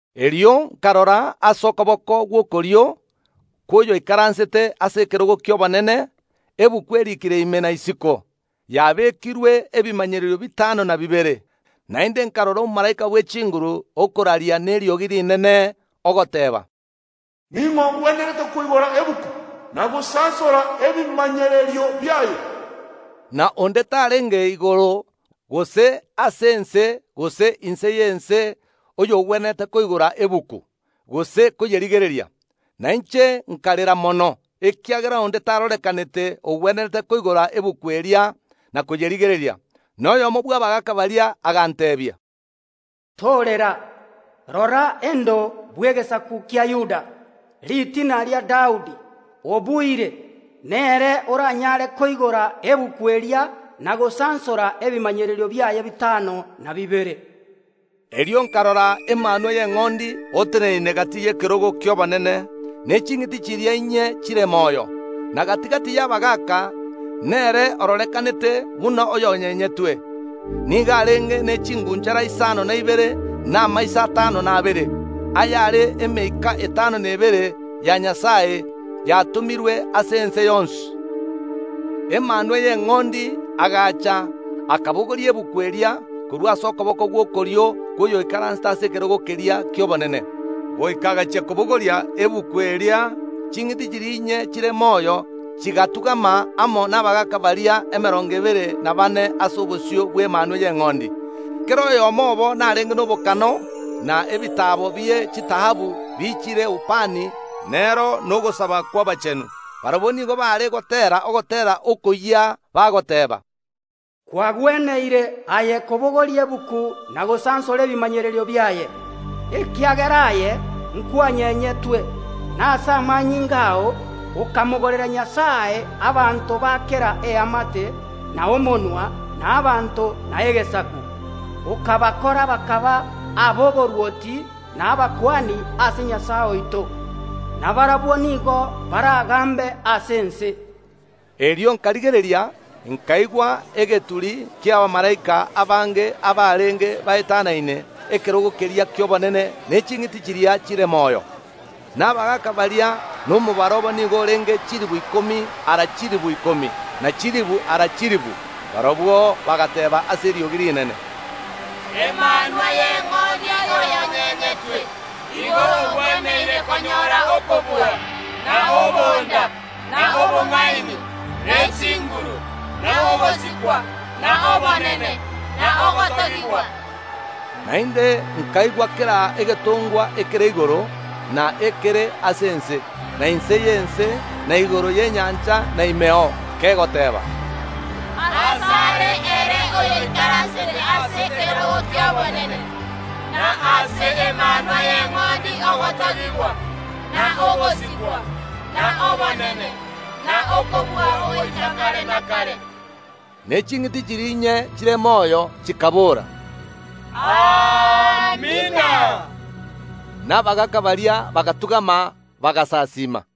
Erio nkarora ase okoboko gw’okorio kw’oyoikaransete ase ekerogo ki’obonene egetabu eriikire ime na isiko, yabekirwe ebimanyererio bitano na bibere. Naende nkarora omomalaika bw’echinguru okoraria neriogi rinene, ogoteeba, “Ning’o ogwenerete koigora egetabu, na gosansora ebimanyererio biaye?” Na onde tarenge igoro, gose ase ense, gose inse y’ense oyogwenerete koigora egetabu, gose koyerigereria. Na inche nkarera mono, ekiagera onde tarorekanete ogwenerete koigora egetabu eria, na koyerigereria. Na oyomo bw’abagaaka baria aganteebia, “Torera, rora Endo y’egesaku kia Yuda, Ritina ria Daudi, obuire, nere oranyare koigora egetabu eria na gosansora ebimanyererio biaye bitano na bibere.” Erio nkarora Emanwa y’Eng’ondi, oteneine gati y’ekerogo ki’obonene ne ching’iti chiria inye chire moyo, na gati‐gati y’abagaaka; nere ororekanete buna oyonyenyetwe. Nigo arenge ne ching’unchara isano na ibere na amaiso atano na abere, ayare emeika etano na ebere ya Nyasae, yatomirwe ase ense yonsi. Emanwa y’Eng’ondi agaacha, akabogoria egetabu eria korwa ase okoboko gw’okorio kw’oyoikaransete ase ekerogo keria ki’obonene. Goika agachia kobogoria egetabu eria, ching’iti chiria inye chire moyo chigatung’ama amo nabagaaka baria emerongo ebere na baane ase obosio bw’Emanwa y’Eng’ondi. Kera oyomo obo narenge nobokano na ebitaabo bie chitaabu biichire ubani nero nogosaba kw’abachenu. Barabwo nigo baare goteera ogoteera okoyia, bagoteeba, “Kwagweneire aye kobogoria egetabu na gosansora ebimanyererio biaye, ekiagera aye nkwanyenyetwe, na ase amanyinga ao okamogorera Nyasae abanto ba kera eamate, na omonwa, na abanto, na egesaku, okabakora bakaba ab’oborwoti na abakuani ase Nyasae oito, na barabwo nigo baragambe ase ense.” Erio nkarigereria, nkaigwa egeturi ki’abamalaika abange abarenge baetanaine ekerogo keria ki’obonene ne ching’iti chiria chire moyo, na abagaaka baria; na omobaro obo nigo orenge chilifu ikomi ara chilifu ikomi, ne chilifu ara chilifu. Barabwo bagateeba ase eriogi rinene, “Emanwa y’Eng’ondi oyonyenyetwe igo ogweneire konyora okobua, na obonda, na obong’aini, ne chinguru, na ogosikwa, na obonene, na ogotogigwa.” Naende nkaigwa kera egetongwa ekere igoro, na ekere ase ense, na inse y’ense, na igoro y’enyancha na imeo, kegoteeba, “Asare ere oyoikaransete ase ekerogo ki’obonene, na ase Emanwa y’Eng’ondi ogotogigwa, na ogosikwa, na obonene, na okobua goika kare na kare!” Ne ching’iti chiria inye chire moyo chikabora, “Amina!” Na abagaaka baria bagatung’ama, bagasasiima.